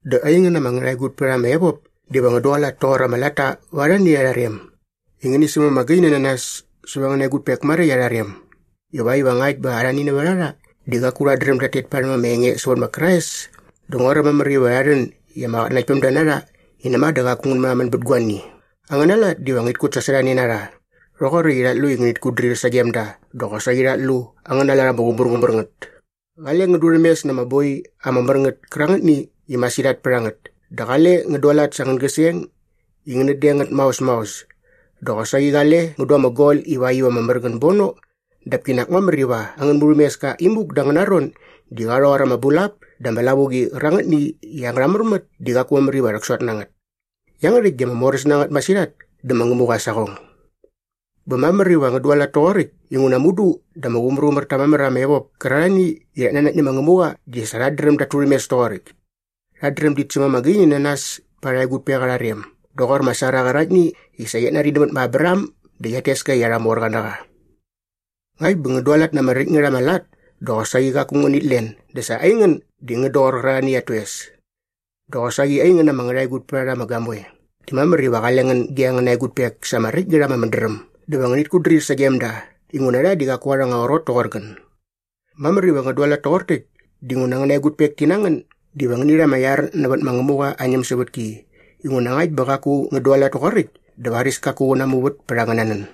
Dä aingän ama ngärhaegutpärharha ama evop diva ngän dualat toqor ama latta va arhani arha rem i ngäni säm ama gaini na nas säva angäna egutpek maräkt arha rem ivakt iva ngakt bä arhani nävät a rha di qaku rhat dräm dat tet parhäm ama enge sävät ma Krais dä nguaräm mamär iva rha rhän i ama qatnanaktpämda na rha i näma dä qaku ngän märhamän bät guani. Angäna lat diva ngärhit kutsasorhane na rha rhoqoräkt i rhat lu i ngänit kutdrir sagem da dä qosaqi rhat lu angäna lat ama qumärqumär ngät. Qale ngän durhämes na ama boi ama mär ngät kärangätni i masirhat pät a ngät dä qale ngän dualat sa angän gäseng i ngänät deng ngät maos maos dä qosaqi qale ngän du ama gol ivakt iva ama mär ngän bono dap kinak mamär iva angän murhämeska imuk da angäna ron di qa rhoqor ama bulap dä ama lavuqi qärangätni i angärha märmät di qaku mamär iva rhäksot na ngät. Iangärhäkt di ama moräs na ngät masirhat dä ma Ngämuqa aa saqong. Bä mamär iva ngän dualat toqoräkt inguna mudu dä ama qumärqumär ta mamär ama evop kärarhani i rhat nanakt nä ma Ngämuqa di sa rhat dräm dat turhämes toqoräkt. Rhat dräm dit säm ama gaini na nas pa arha egutpek arha rem doqor ma Sara qäraktni i sa qiat nari nämät ma Abraham dä qiat tes ka i arha morqa na qa. Ngakt bä ngän dualat na ama räkt ngät ama lat dä qosaqi qaku ngänit len dä sa aingän di ngän doqor qärarhani at toes. Dä qosaqi aingän ama ngärhaegutpärharha ama gamoe, di mamär iva qale ngän ge angäna egutpek sa ama räkt ngät ama mädräm dä va ngänit kutdrir sagem da inguna rha di qaku arha anga qrot toqor ngän. Mamär iva ngän dualat toqor täkt dinguna angäna egutpek ti na ngän diva ngäni rha ama iar nävät ma Ngämuqa aa ñämsävätki inguna ngakt bä qaku ngän dualat toqoräkt dä varis kaku qä namuvät pät angäna nän.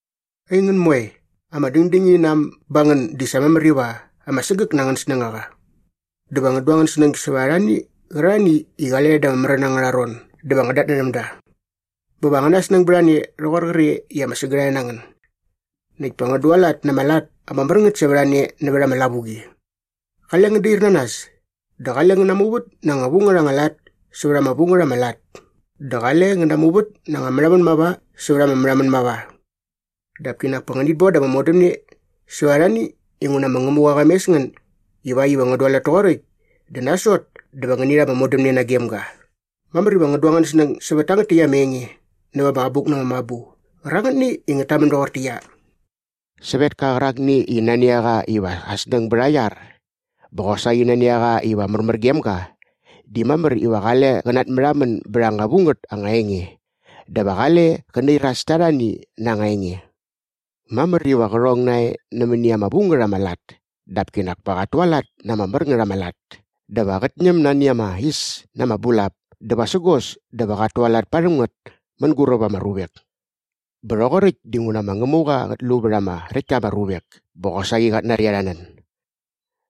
Aingän moe, ama dängdängini na äm ba ngän di sa mamär iva ama sägäk na angän snängaqa. Dä va ngän du angän snäng sävät arhani qärarhani i qale rha da ama märän angärha ron dä va ngän datnärhäm da. Bä va angäna snäng bät a ne rhoqor qre i ama sägärhae na ngän. Näkt pa ngän dualat na ama lat ama mär ngät sävät a ne nävät ama lavuqi. Qale ngän dair na nas. Dä qale ngän namuvät na anga vu ngät anga lat sävät ama vu ngät ama lat dä qale ngän namuvät na anga märhamän mava sävät ama märhamän mava. Dap kinak pa ngänit bon da ama modämne sävät arhani inguna ma Ngämuqa qa mes ngän ivakt iva ngän dualat toqoräkt dä nasot dä va ngäni rha ama modämne nagem ga. Mamär iva ngän du angän snäng sävät tangät täkt ama enge näva ama Abuk na ama Mabu qärangätni i ngät tamän doqortäqyia, “Sävetka qärakni i nani a qa iva aa snäng bät aa iar bä qosaqi nani a qa iva märmär gem ga di mamär iva qale qä natmärhamän bät anga vu ngät anga enge dä va qale qä nairas ta arhani na anga enge. Mamär iva qä rhong nae nämäni ama vu ngät ama lat dap kinak pa qat tualat na ama mär ngät ama lat. Dä va qät ñäm nani ama is na ama bulap dä vasägos dä va qat tualat parhäm ngät mänguräp ama ruvek. Bä rhoqoräkt dinguna ma Ngämuqa qät lu vät ama räkt ta ama ruvek bä qosaqi qat nari arha nän.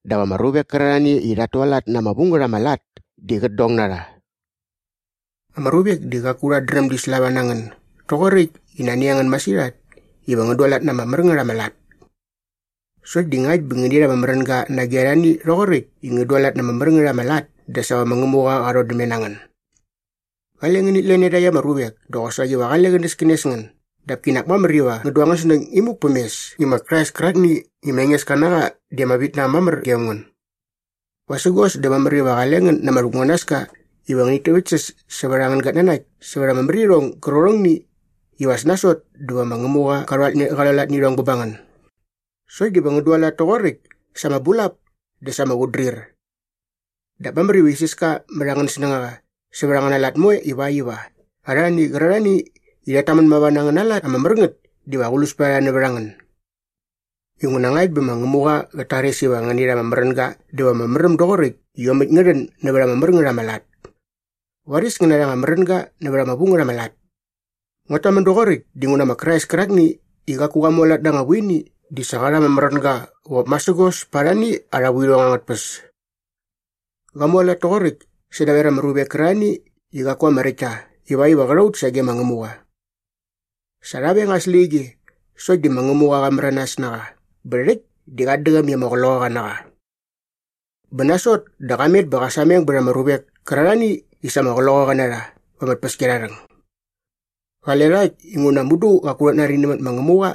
Dap ama ruvek kärarhani i rhat tualat na ama vu ngät ama lat di qät dong na rha.” Ama ruvek di qaku rhat dräm di slava na ngän doqoräkt i nani a ngän masirhat iva ngän dualat na ama mär ngät ama lat. Sokt di ngakt bä ngäni rha ama märänga nage arhani rhoqoräkt i ngän dualat na ama mär ngät ama lat dä sa va ma Ngämuqa qa rhodämne na ngän. Qale ngänit len iarhakt ama ruvek dä qosaqi va qale qänäskänes ngän dap kinak mamär iva ngän du angän snäng imuk päm mes i ma Krais kärakni i ma Engeska na qa di ama vitnaäm mamär gem ngän. Vasägos dä mamär iva qale ngän na ama rhäkmunanaska iva ngänit täväktsäs sävät angän gatnanakt sävät ama märirhong gärqärhongni iva as nasot dä va ma Ngämuqa qa rhualat nä irhong bä ba ngän. Sokt diva ngän dualat toqoräkt sa ama bulap dä sa ama qutdrir. Dap mamär iva isiska mät angän snängaqa sävät angäna lat moe ivakt iva arhani qärarhani i rhat tamän mava na angäna lat ama mär ngät diva aqlus pät a rha nävät a ngän. Inguna ngakt bä ma Ngämuqa qät tares iva ngäni rha ama märänga dä va ama märäm doqoräkt i iomäkt ngä rhän nävät ama mär ngät ama lat. Varis ngän narha anga märänga nävät ama vu ngät ama lat. Nguat tamän doqoräkt dinguna ma Krais kärakni i qaku qa mualat na anga vuini di sa qa rha ama märänga qop masägos pät arhani arha vuirhong angät tpäs. Qa mualat toqoräkt sädaver ama ruvek kärarhani i qaku ama räkt ta ivakt iva qä rha ut sage ma Ngämuqa. Sa rha veng aa släqyige sokt di ma Ngämuqa qa märanas na qa bä rhäkt di qat däqäm i ama qloqaqa na qa. Bä nasot dä qa met bä qa sameng bät ama ruvek kärarhani i sa ama qloqaqa na rha va ama tpäskiarharhäng. Qale rha äkt inguna mudu qaku rhat nari nämät ma Ngämuqa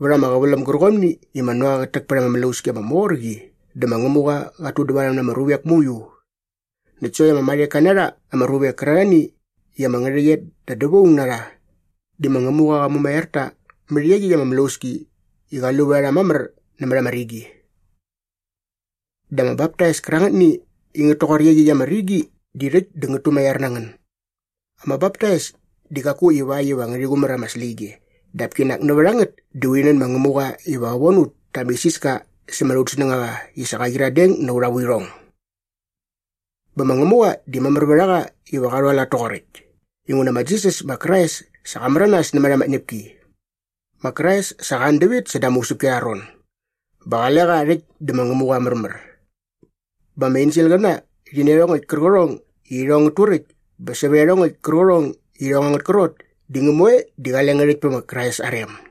vät ama qäväläm gärqomni i ma Noa qät täk pät ama mlauski ama mor qi dä ma Ngämuqa qat tudävarhäm na ama ruvek mauiu. Näkt sokt ama marheka na rha ama ruvek kärarhani i ama ngärhäqyet da dävaung na rha di ma Ngämuqa qa mumaiar ta mät iaqyäkt ama mlauski i qa lu vät a rha mamär nämät ama rigi. Dä ama baptais kärangätni i ngät toqor iaqyäkt ama rigi di rhäkt dä ngät tumaiar na ngän. Ama baptais di qaku ivakt iva ngärhi qumär ama släqyige dap kinak nävät a ngät di urhi nän ma Ngämuqa iva qä von ut ta ama isiska sämät aut snängaqa i sa qa qyiradeng na aurha vuirhong. Bä ma Ngämuqa di mamär vät a qa iva qa rhualat toqoräkt inguna ma Jisas ma Krais sa qa märanas nämät ama tñäpki. Ma Krais sa qa an dävit säda ama usäpki arha ron bä qale qa rhäkt dä ma Ngämuqa aa märmär. Bä ama enselqäna rhi nä iarhongäkt kärqärhong i irhong ngät turäkt bä sävät iarhongäkt kärqärhong i irhong angät krot di ngä moe di qale ngät äkt pä ma Krais aa rem.